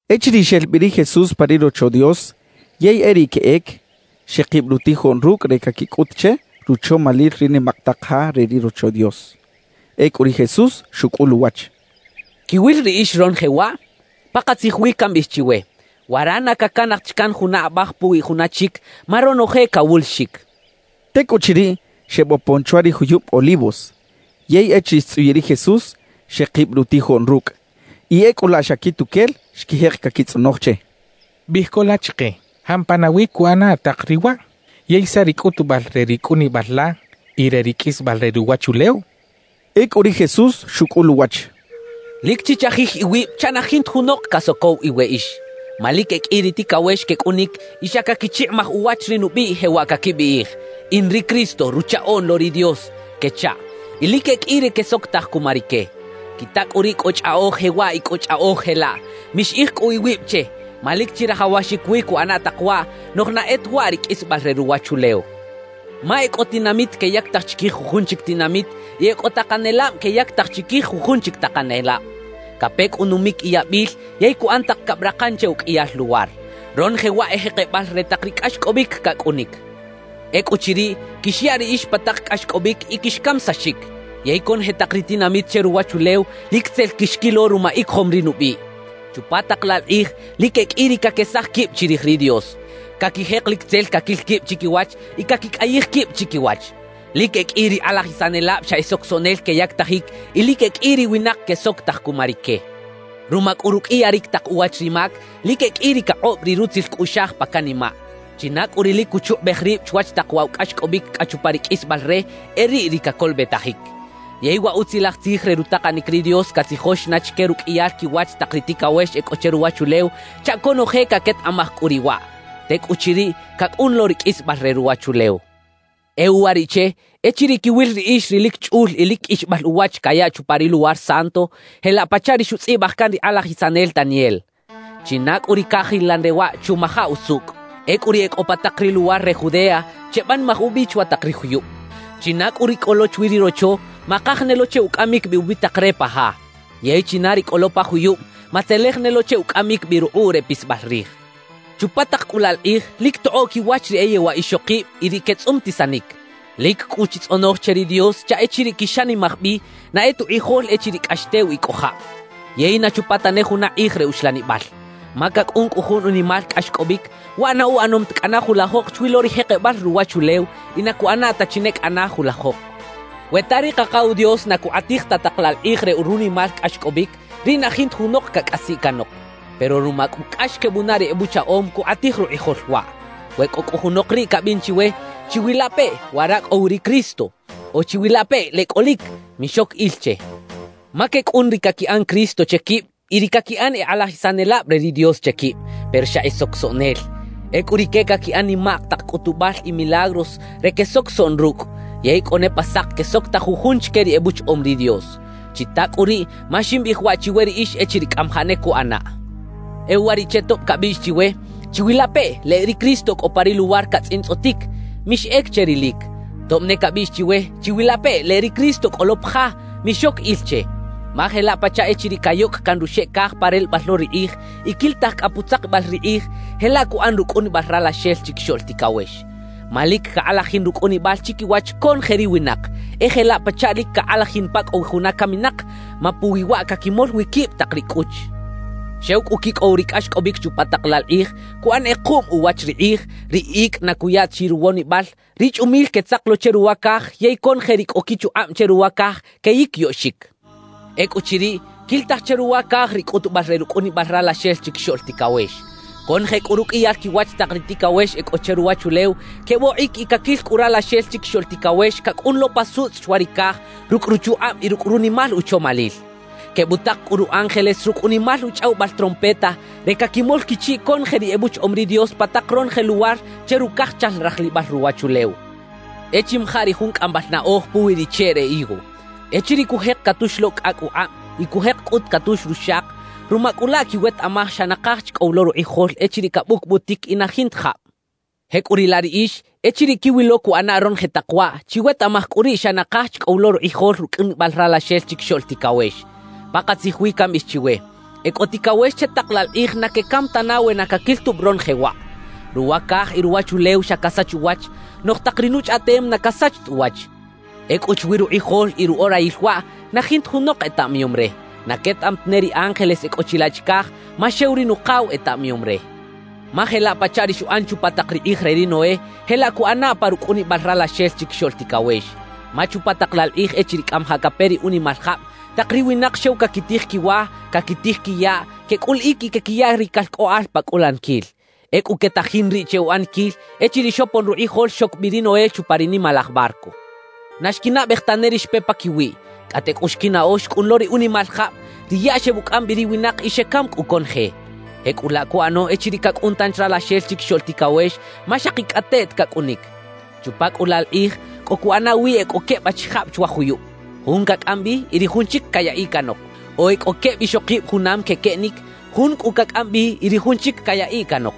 Echiriꞌ xel bi ri Jesús pa ri Rocho Dios yey e riꞌ queꞌec, xekib rutijoꞌn rucꞌ re caquicꞌut che, ruchomalil ri nimak tak ja re ri Rocho Dios. Ecꞌu ri Jesús xucꞌul uwach: —¿Quiwil riꞌix ronoje waꞌ? Pakatzij wi cambiꞌij chiwe, wara na cacanaj ta chi can juna abaj puwi juna chic, ma ronoje cawulixic —xchaꞌ. Tecꞌuchiriꞌ, xebopon chwa ri juyub Olivos. Yey echiriꞌ xtzꞌuyiꞌ ri Jesús, xekib rutijoꞌn rucꞌ, y ecꞌu laꞌ xa quituquel xquijek caquitzꞌonoj che: —Biꞌij co la chike, ¿jampa nawi cuꞌana tak riꞌ waꞌ? ¿Yey saꞌ ri cꞌutubal re ri cꞌunibal la y re ri qꞌuisbal re ruwachulew? —xechaꞌ. Ecꞌu ri Jesús xucꞌul uwach: «Lic chichajij iwib chaꞌ na jinta junok casocow iweꞌix. Ma lic e qꞌui ri ticawex quecꞌunic y xa caquichikꞌimaj uwach ri nubiꞌ, jewaꞌ caquibiꞌij: “In ri Cristo, Ruchaꞌoꞌn lo ri Dios” quechaꞌ. Y lic e qꞌui ri quesocotaj cuma rique. »Quita cꞌu riꞌ cꞌo chꞌaꞌoj jewaꞌ y cꞌo chꞌaꞌoj jelaꞌ. Mixiꞌij cꞌu iwib che, ma lic chirajawaxic wi cuꞌana tak waꞌ; noꞌj na e ta waꞌ ri qꞌuisbal re ruwachulew. Ma e cꞌo tinamit queyactaj chiquij jujun chic tinamit y e cꞌo takanelab queyactaj chiquij jujun chic takanelab. Cape cꞌu numic y yabil yey cuꞌan tak cabrakan che uqꞌuiyal luwar. Ronoje waꞌ e jekebal re tak ri cꞌaxcꞌobic cacꞌunic. »Ecꞌuchiriꞌ, quixyaꞌ riꞌix pa tak cꞌaxcꞌobic y quixcamisaxic; yey conoje tak ri tinamit che ruwachulew lic tzel quixquilo ruma icojom ri nubiꞌ. Chupa tak laꞌ laꞌ kꞌij, lic e qꞌui ri caquesaj quib chirij ri Dios, caquijek lic tzel caquil quib chiquiwach y caquicꞌayij quib chiquiwach. »Lic e qꞌui ri kꞌalajisanelab xa e socosoꞌnel queyactajic y lic e qꞌui ri winak quesocotaj cuma rique. Ruma cꞌu ruqꞌuiyaric tak uwach ri mac, lic e qꞌui ri cakꞌob ri rutzil cꞌuꞌxaj pa canimaꞌ. China cꞌu ri lic cuchukꞌubej rib chwach tak waꞌ wa cꞌaxcꞌobic cꞌa chupa ri qꞌuisbal re, e riꞌ ri cacolobetajic. »Yey wa Utzilaj Tzij re rutakanic ri Dios catzijox na chique ruqꞌuiyal quiwach tak ri ticawex e cꞌo che ruwachulew chaꞌ conoje caquetaꞌmaj cꞌu riꞌ waꞌ; tecꞌuchiriꞌ, cacꞌun lo ri qꞌuisbal re ruwachulew. »E uwariꞌche echiriꞌ quiwil riꞌix ri lic chꞌul y lic qꞌuixbal uwach cayaꞌ chupa ri Luwar Santo, jelaꞌ pachaꞌ ri xutzꞌibaj can ri kꞌalajisanel Daniel; (china cꞌu ri cajilan re waꞌ, chumaja usucꞌ), ecꞌu ri e cꞌo pa tak ri luwar re Judea chebanimaj ubi chwa tak ri juyub. China cꞌu ri cꞌo lo chwi ri rocho, makaj ne lo che ucꞌamic bi ubitak re pa ja. Yey china ri cꞌo lo pa juyub, matzelej ne lo che ucꞌamic bi rukꞌuꞌ re pisbal rij. »Chupa tak cꞌu laꞌ la kꞌij, lic tokꞌoꞌ quiwach ri e yewaꞌ ixokib y ri quetzꞌumtisanic. Lic cꞌu chitzꞌonoj che ri Dios chaꞌ echiriꞌ quixanimaj bi, na e ta ukꞌijol echiriꞌ cꞌax tew y cꞌo jab yey na chupa tane juna kꞌij re uxlanibal. Ma cacꞌun cꞌu jun unimal cꞌaxcꞌobic, waꞌ na uꞌanom ta cꞌana julajok chwi lo ri jekebal ruwachulew y na cuꞌana ta chi ne cꞌana julajok. We ta ri Kakaw Dios na cukꞌatij ta tak laꞌ la kꞌij re runimal cꞌaxcꞌobic, riꞌ na jinta junok cacꞌasiꞌ canok; pero ruma cꞌu cꞌax quebunaꞌ ri ebuchaꞌom, cukꞌatij rukꞌijol waꞌ. »We cꞌo cꞌu junok riꞌ cabiꞌn chiwe: “¡Chiwilapeꞌ, wara cꞌo wi ri Cristo!” o “¡Chiwilapeꞌ, leꞌ cꞌolic!”, mixoc il che. Ma quecꞌun ri caquiꞌan “Cristo” che quib y ri caquiꞌan “e kꞌalajisanelab re ri Dios” che quib, pero xa e socosoꞌnel. Ecꞌu rique caquiꞌan nimak tak cꞌutubal y milagros re quesocosoꞌn rucꞌ, yey cꞌo ne pa sak quesocotaj jujun chique ri ebuchaꞌom ri Dios. »Chita cꞌu riꞌ ma ximbiꞌij waꞌ chiwe riꞌix echiriꞌ cꞌamajaꞌ ne cuꞌanaꞌ. E uwariꞌche tob cabiꞌx chiwe: “Chiwilapeꞌ, leꞌ ri Cristo cꞌo pa ri luwar catzꞌintzꞌotic”, mixꞌec che rilic. Tob ne cabiꞌx chiwe: “Chiwilapeꞌ, leꞌ ri Cristo cꞌo lo pa ja”, mixoc il che. Ma jelaꞌ pachaꞌ echiriꞌ cayocꞌ caꞌn ruxeꞌ caj pa relebal lo ri kꞌij y quilitaj cꞌa putzakibal ri kꞌij, jelaꞌ cuꞌan rucꞌunibal Ralaxel Chiquixoꞌl Ticawex. Ma lic cakꞌalajin rucꞌunibal chiquiwach conoje ri winak; e jelaꞌ pachaꞌ lic cakꞌalajin pa cꞌo wi juna caminak, ma puwi waꞌ caquimol wi quib tak ri cꞌuch. »Xew cꞌu quicꞌow ri cꞌaxcꞌobic chupa tak laꞌ la kꞌij, cuꞌan kꞌekuꞌm uwach ri kꞌij, ri icꞌ na cuya ta chi ruwonibal, ri chꞌumil quetzak lo che ruwa caj yey conoje ri cꞌo quichukꞌab che ruwa caj queyiquiyoꞌxic. Ecꞌuchiriꞌ, quilitaj che ruwa caj ri cꞌutubal re rucꞌunibal Ralaxel Chiquixoꞌl Ticawex. Conoje cꞌu ruqꞌuiyal quiwach tak ri ticawex e cꞌo che ruwachulew quebokꞌic y caquil cꞌu Ralaxel Chiquixoꞌl Ticawex cacꞌun lo pa sutzꞌ chwa ri caj rucꞌ ruchukꞌab y rucꞌ runimal uchomalil. Quebutak cꞌu ru ángeles rucꞌ unimal uchꞌawibal trompeta re caquimol quichiꞌ conoje ri ebuchaꞌom ri Dios pa tak ronoje luwar che rucajchal rajlibal ruwachulew. »E chimaja ri jun cꞌambal naꞌoj puwi ri cheꞌ re higo: Echiriꞌ cujek catux lo cꞌacꞌ ukꞌab y cujek cꞌut catux ruxak, ruma cꞌu laꞌ quiwetaꞌmaj xa nakaj chi cꞌo wi lo rukꞌijol echiriꞌ cabucbutic y na jinta jab. Jecꞌuriꞌlaꞌ riꞌix, echiriꞌ quiwilo cuꞌana ronoje tak waꞌ, chiwetaꞌmaj cꞌu riꞌ xa nakaj chi cꞌo wi lo rukꞌijol rucꞌunibal Ralaxel Chiquixoꞌl Ticawex. Pakatzij wi cambiꞌij chiwe: E cꞌo ticawex che tak laꞌ la kꞌij na quecam tana we na caquil tubi ronoje waꞌ. Ruwa caj y ruwachulew xa casach uwach, noꞌj tak ri nuchꞌaꞌtem na casach ta uwach. »Ecꞌu chwi rukꞌijol y ruꞌorayil waꞌ, na jinta junok etaꞌmayom re; na quetaꞌam tane ri ángeles e cꞌo chilaꞌ chicaj, ma xew ri Nukaw etaꞌmayom re. Ma jelaꞌ pachaꞌ ri xuꞌan chupa tak ri kꞌij re ri Noé, jelaꞌ cuꞌana pa rucꞌunibal Ralaxel Chiquixoꞌl Ticawex. Ma chupa tak laꞌ la kꞌij echiriꞌ cꞌamajaꞌ cape ri unimal jab, tak ri winak xew caquitij quiwa, caquitij quiyaꞌ, quecꞌuliꞌic y quequiya ri calcꞌoꞌal pa cꞌulaniquil. Ecꞌu quetajin riꞌ che uꞌaniquil echiriꞌ xopon rukꞌijol xoc bi ri Noé chupa ri nimalaj barco. Na xquinaꞌbej tane ri xpe paquiwiꞌ, cꞌate cꞌu xquinaꞌo xcꞌun lo ri unimal jab; ri yaꞌ xebucꞌam bi ri winak y xecam cꞌu conoje. Jecꞌulaꞌ cuꞌano echiriꞌ cacꞌun tanchi Ralaxel Chiquixoꞌl Ticawex, ma xakicꞌateꞌt cacꞌunic. »Chupa cꞌu laꞌ la kꞌij, cꞌo cuꞌana wi e cꞌo queb achijab chwa juyub; jun cacꞌam bi y ri jun chic cayaꞌiꞌ canok. O e cꞌo queb ixokib junam quequeꞌnic, jun cꞌu cacꞌam bi y ri jun chic cayaꞌiꞌ canok.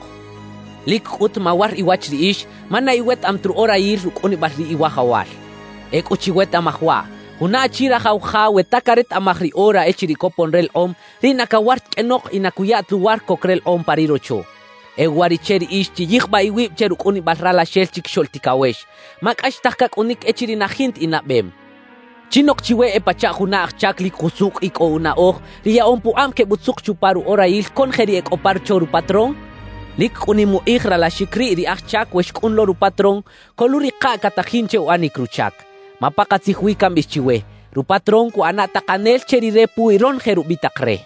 Lic cꞌut mawar iwach riꞌix, ma na iwetaꞌam ta ruꞌorayil rucꞌunibal ri Iwajawal. »Ecꞌu chiwetaꞌmaj waꞌ: Juna achi rajaw ja we ta caretaꞌmaj ri ora echiriꞌ copon relekꞌom, riꞌ na cawar ta qꞌuenok y na cuya ta luwar coc relekꞌom pa ri rocho. E uwariꞌche riꞌix chiyijbaꞌ iwib che rucꞌunibal Ralaxel Chiquixoꞌl Ticawex, ma cꞌaxtaj cacꞌunic echiriꞌ na jinta inaꞌbem. »¿Chinok chiwe e pachaꞌ juna aj chac lic jusucꞌ y cꞌo unaꞌoj, ri yaꞌom pukꞌab quebutzuk chupa ruꞌorayil conoje ri e cꞌo pa rocho rupatrón? Lic cꞌu nim ukꞌij ralaxic riꞌ ri aj chac we xcꞌun lo rupatrón, coluꞌrikaꞌ catajin che uꞌanic ruchac. Ma pakatzij wi cambiꞌij chiwe: Rupatrón cuꞌana takanel che rire puwi ronoje rubitak re.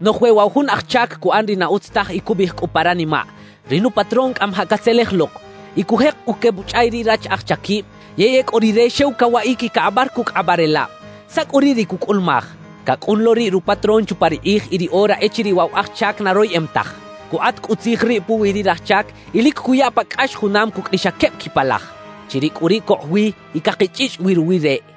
»Noꞌj we waꞌ wa jun aj chac cuꞌan ri na utz taj y cubiꞌij cꞌu pa ranimaꞌ: “Ri nupatrón cꞌamajaꞌ catzelej lok” y cujek cꞌu quebuchꞌay ri rach aj chaquib; yey ecꞌu rire xew cawaꞌic y cakꞌabar cucꞌ kꞌabaꞌrelab, ¿saꞌ cꞌu riꞌ ri cucꞌulumaj? Cacꞌun lo riꞌ rupatrón chupa ri kꞌij y ri ora echiriꞌ waꞌ wa aj chac na royeꞌem taj. Cukꞌat cꞌu tzij riꞌ puwi ri raj chac y lic cuya pa cꞌax junam cucꞌ ri xa queb quipalaj, chiriꞌ cꞌu riꞌ cokꞌ wi y cakichꞌichꞌ wi ruwi reꞌ.